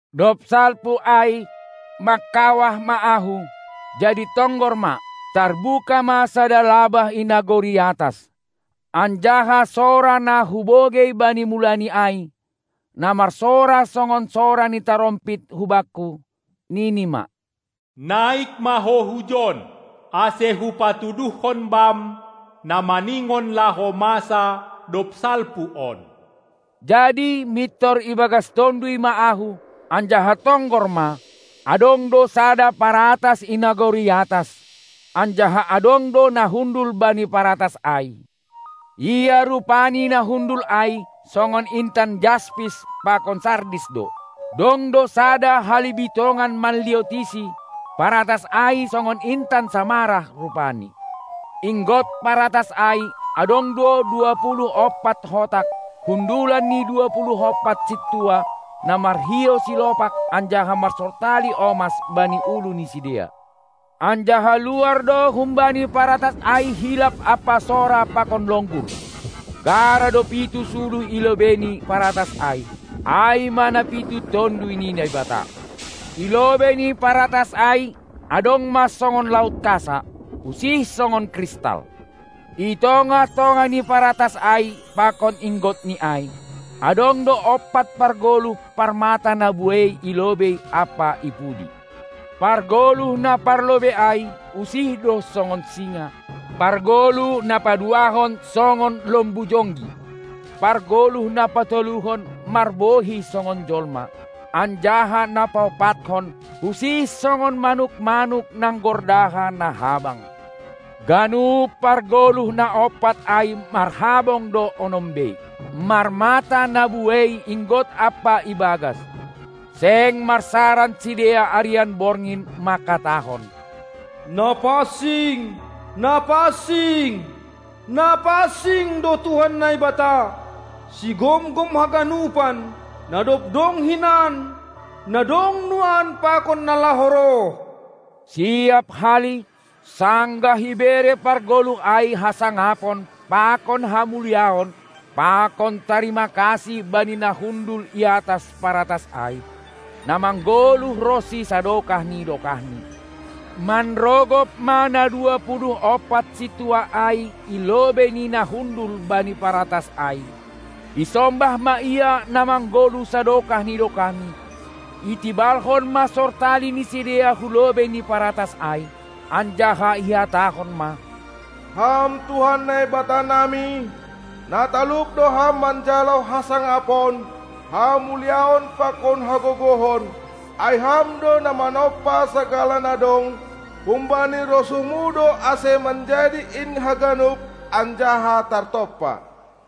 Dob salpu ai, mangkawah ma ahu, jadi tonggor ma, tarbuka ma sada labah i nagori atas. Anjaha sora na hubogei bani mulani ai, na marsora songon sora ni tarompit hubakku, nini ma: Naik ma ho hujon, ase Hupatuduhkon bam na maningon laho masa, dob salpu on. Jadi mintor ibagas Tonduy ma ahu, anjaha tonggor ma, adong do sada paratas i nagori atas, anjaha adong do na hundul bani paratas ai. Ia rupaNi na hundul ai songon intan jaspis pakon sardis do. Dong do sada halibitongan manliotisi paratas ai songon intan samarah rupani. Inggot paratas ai adong do dua puluh ompat hotak, hundulan ni dua puluh ompat sintua, na marhiou silopak anjaha marsortali omas bani ulu ni sidea. Anjaha luar do humbani paratas ai hilap ampa sora pakon longgur. Gara do pitu suluh i lobei ni paratas ai, ai ma na pitu Tonduy ni Naibata. I lobei ni paratas ai adong ma songon laut kasa usih songon kristal. I tongah-tongah ni paratas ai pakon inggotni ai, adong do ompat pargoluh, parmata na buei i lobei ampa i pudi. Pargoluh na parlobei ai usih do songon singa, pargoluh na paduahon songon lombu jonggi, pargoluh na patoluhon marbohi songon jolma, anjaha na paompathon usih songon manuk-manuk nanggordaha na habang. Ganup pargoluh na ompat ai marhabong do onom bei; marmata na buei inggot ampa ibagas. Seng marsaran sidea arian borngin manghatahon: Na pansing, na pansing, na pansing do Tuhan Naibata, Sigomgom haganupan, na dob dong hinan, na dong nuan pakon na laho roh. Siap hali, sanggah ibere pargoluh ai hasangapon pakon hamuliaon pakon tarima kasih bani na hundul i atas paratas ai, na manggoluh ronsi sadokah ni dokahni, manrogop ma na dua puluh ompat sintua ai i lobei ni na hundul bani paratas ai, isombah ma Ia na manggoluh sadokah ni dokahni, itibalhon ma sortali ni sidea hulobei ni paratas ai, anjaha ihatahon ma: Ham Tuhan Naibatanami, na talup do ham manjalo hasangapon, hamuliaon pakon hagogohon, ai Ham do na manompa sagala na dong; humbani rosuhmu do ase manjadi in haganup anjaha tartompa.